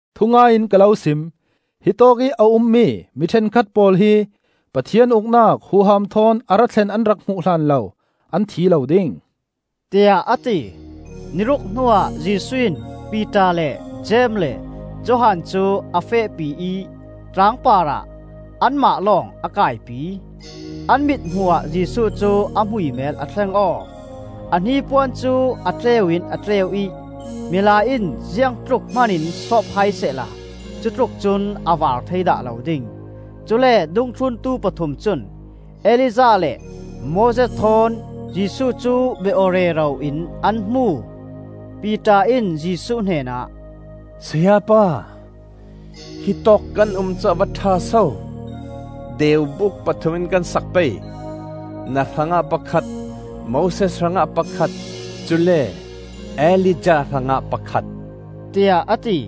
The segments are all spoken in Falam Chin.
Thungai in ka lo sim: hi tawkih a ummi mi ṭhenkhat pawl hi Pathian Uknak huham thawn a ra thlen an rak hmuh hlan lo an thi lo ding,” tiah a ti. Ni ruk hnuah Jesuh in Piter le Jeim le Johan cu a fehpi ih tlang parah anmah lawng a kaipi. An mit hmuhah Jesuh cu a hmuihhmel a thleng aw; a hnipuan cu a tleu in a tleu ih milai in ziangtluk hmanin sawp hai sehla cutluk cun a vaar thei dah lo ding. Cule dungthluntu pathum cun Elijah le Moses thawn Jesuh cu bia aw rero in an hmu. Piter in Jesuh hnenah, “Sayapa, hitawk kan um cu a va ṭha so! Deubuk pathum in kan sak pei; na hrangah pakhat, Moses hrangah pakhat, cule Elijah hrangah pakhat,” tiah a ti.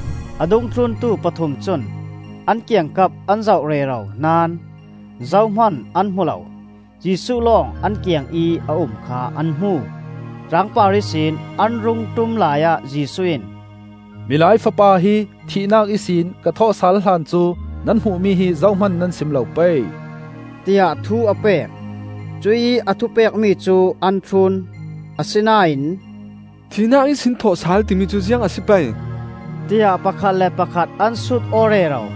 A dungthluntu pathum cun an kiangkap an zoh rero naón zohman an hmu lo; Jesuh lawng an kiangih a um kha an hmu. Tlangpar ihsin an rung ṭum laiah Jesuh in, “Milai Fapa hi thihnak ihsin ka thawhsal hlan cu nan hmuhmi hi zohman nan sim lo pei,” tiah thu a pek. Cuih a thupekmi cu an thlun; asinain, “Thihnak ihsin thawhsal,” timi cu ziang a si pei? tiah pakhat le pakhat an sut aw rero.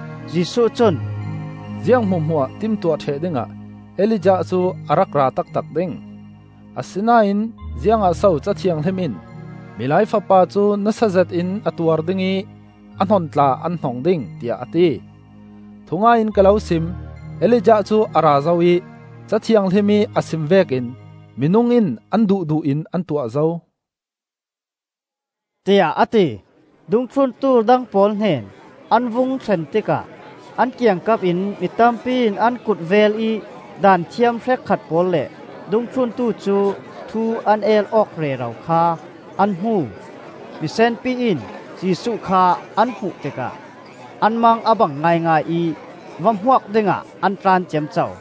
Jesuh cun, “Ziang hmuahhmuah timtuah ṭheh dingah Elijah cu a ra taktak ding. Asinain ziangah so Ca Thianghlim in ‘Milai Fapa cu nasa zetin a tuar ding ih a hnon tla an hnong ding,’ tiah a ti? Thungai in ka lo sim: Elijah cu a ra zo ih, Ca Thianghlim ih a sim vekin minung in an duhduh in an tuah zo,” tiah a ti. Dungthluntu dang pawl hnen an vung thlen tikah an kiangkap in mitampi in an kulhvel ih Daanthiam hrekkhat pawl le dungthluntu cu thu an el awk rero kha an hmu. Misenpi in Jesuh kha an hmuh tikah an mang a bang ngaingai ih va hmuak dingah an tlan ciamco.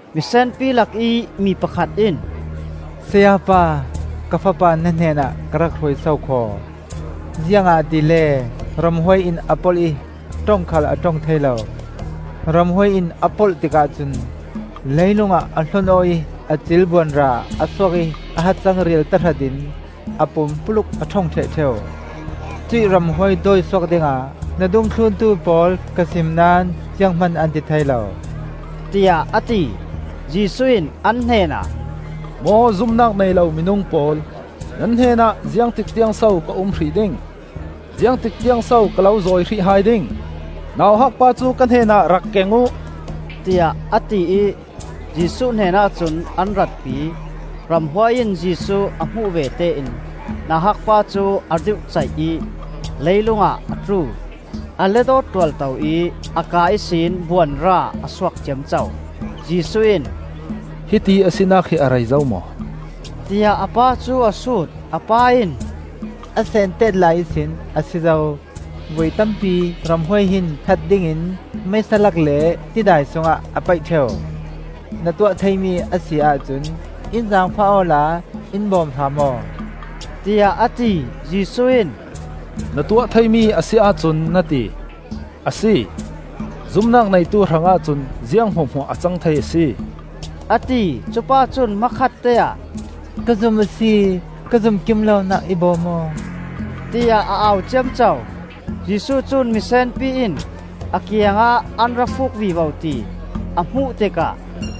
Misenpi lakih mi pakhat in, “Sayapa, ka fapa na hnenah ka rak hruai sokhaw; ziangahtile ramhuai in a polh ih ṭong khal a ṭong thei lo. Ramhuai in a polh tikah cun, leilung ah a hlon aw ih a cil buanra a suak ih a hacang rial tahratin a pumpuluk a ṭhong ṭheh ṭheu. Cuih ramhuai dawisuak dingah na dungthluntu pawl ka sim naón zianghman an ti thei lo,” tiah a ti. Jesuh in an hnenah, “Maw zumnak nei lo minung pawl! Nan hnenah ziangtik tiangso ka um hrih ding? Ziangtik tiangso ka lo zawi hrih hai ding? Nauhakpa cu ka hnenah rak keng uh,” tiah a ti ih Jesuh hnenah cun an ratpi. Ramhuai in Jesuh a hmuh vete in nauhakpa cu a dirhcaih ih leilung ah a tlu, a let aw tualto ih a ka ihsin buanra a suak ciamco. Jesuh in, “Hitiih a sinak hi a rei zo maw?” tiah a pa cu a sut. A pa in, “A seentet lai ihsin a si zo. Voi tampi ramhuai hin that dingin meisa lak le tidai sungah a paih ṭheu. Na tuah theimi a si ahcun in zaangfah awla in bawm hram aw,” tiah a ti. Jesuh in, “Na tuah theimi a si ahcun, na ti. A si! Zumnak neitu hrangah cun ziang hmuahhmuah a cang thei a si,” a ti. Cupa cun hmakhatte ah, “Ka zum a si; ka zum kim lonak i bawm aw,” tiah a au ciamco. Jesuh cun misenpi in a kiangah an ra fuk vivo ti a hmuh tikah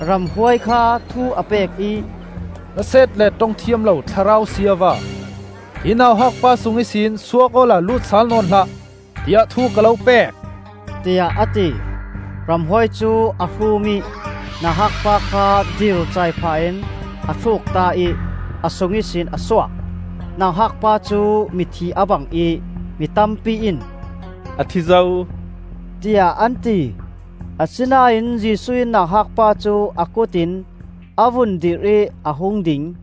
ramhuai kha thu a pek ih, “Hnaset le ṭong thiam lo thlarau siava, hi nauhak pa sung ihsin suak awla lut sal nawn hlah, tiah thu ka lo pek,” tiah a ti. Ramhuai cu a hruum ih nauhak pa kha dircai phah in a thlukta ih a sung ihsin a suak. Nauhak pa cu mithi a bang ih mi tampi in, “A thi zo,” tiah an ti. Asinain Jesuh in nauhak pa cu a kut in a vun dirh ih a hung ding.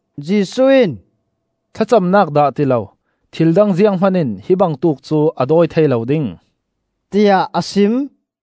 Jesuh in, “Thlacamnak dah ti lo, thildang zianghman in hi bangtuk cu a dawi thei lo ding,” tiah a sim.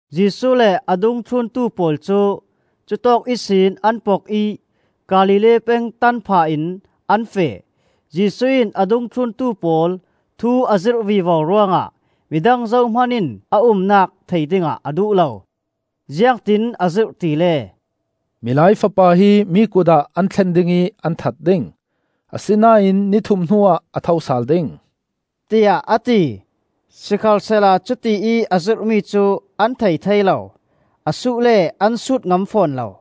Jesuh le a dungthluntu pawl cu cutawk ihsin an pok ih Galilee peng tan phah in an feh. Jesuh in a dungthluntu pawl thu a zirh vivo ruangah midang zohman in a umnak thei dingah a duh lo. Ziangtin a zirh tile: “Milai Fapa hi mi kut ah an thlen ding ih an that ding. Asinain ni thum hnuah a tho sal ding,” tiah a ti. Sikhalsehla cuti ih a zirhmi cu an thei thei lo. A suh le an sut ngam fawn lo.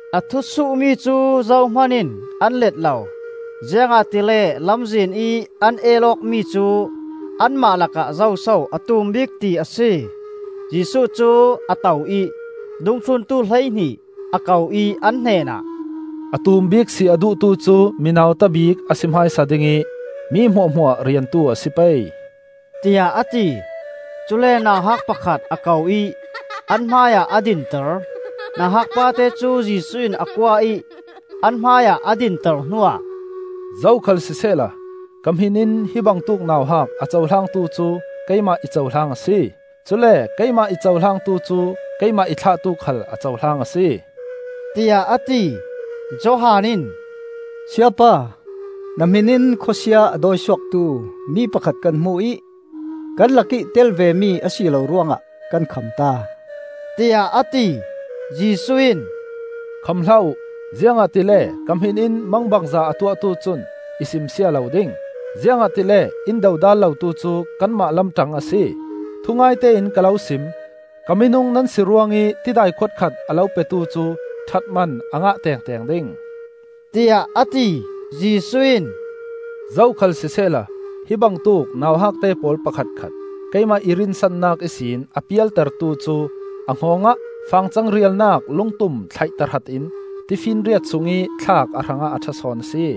A thu suhmi cu zohman in an let lo, ziangahtile lamzinih an el awkmi cu anmah lakah zoso a tum bik ti a si. Jesuh cu a to ih dungthluntu hleihnih a ko ih an hnenah, “A tum bik si a duhtu cu mi nauta bik a si hmaisa ding ih mi hmuahhmuah riantu a si pei,” tiah a ti. Cule nauhak pakhat a ko ih an hmaiah a dinter. Nauhak pate cu Jesuh in a kuah ih an hmaiah a dinter hnuah, “Zokhal sisehla ka hmin in hi bangtuk nauhak a cohlangtu cu keimah i cohlang a si; cule keimah i cohlangtu cu keimah i thlahtu khal a cohlang a si,” tiah a ti. Johan in, “Sayapa, na hmin in khawsia a dawisuaktu mi pakhat kan hmu ih kan lak ih tel vemi a si lo ruangah kan khamta,” tiah a ti. Jesuh in, “Kham hlah uh! Ziangahtile ka hmin in mangbangza a tuahtu cun i simsia lo ding. Ziangahtile in dodal lotu cu kanmah lam ṭang a si. Thungaite in ka lo sim: Ka minung nan si ruangih tidai khuat khat a lo petu cu ṭhatman a ngah tengteng ding,” tiah a ti. Jesuh in, “Zokhal sisehla hi bangtuk nauhakte pawl pakhatkhat keimah i rinsannak ihsin a pialtertu cu a hngawng ah fangcang rialnak lungtum thlaih tahratin tifinriat sungih thlak a hrangah a ṭha sawn a si.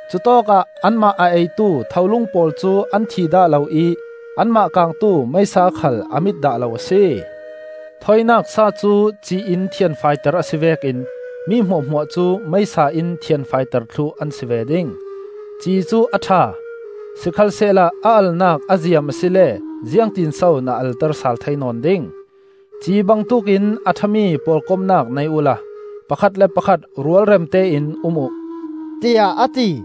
Cutawkah ‘anmah a eitu tholung pawl cu an thi dah lo ih anmah kangtu meisa khal a mit dah lo a si.’ “Thawinak sa cu ci in thianfaiter a si vekin mi hmuahhmuah cu meisa in thianfaiter thluh an si ve ding. “Ci cu a ṭha. Sikhalsehla a alnak a ziam asile ziangtinso na alter sal thei nawn ding? “Ci bangtuk in a ṭha mi pawlkomnak nei uhla pakhat le pakhat rualremte in um uh,” tiah a ti.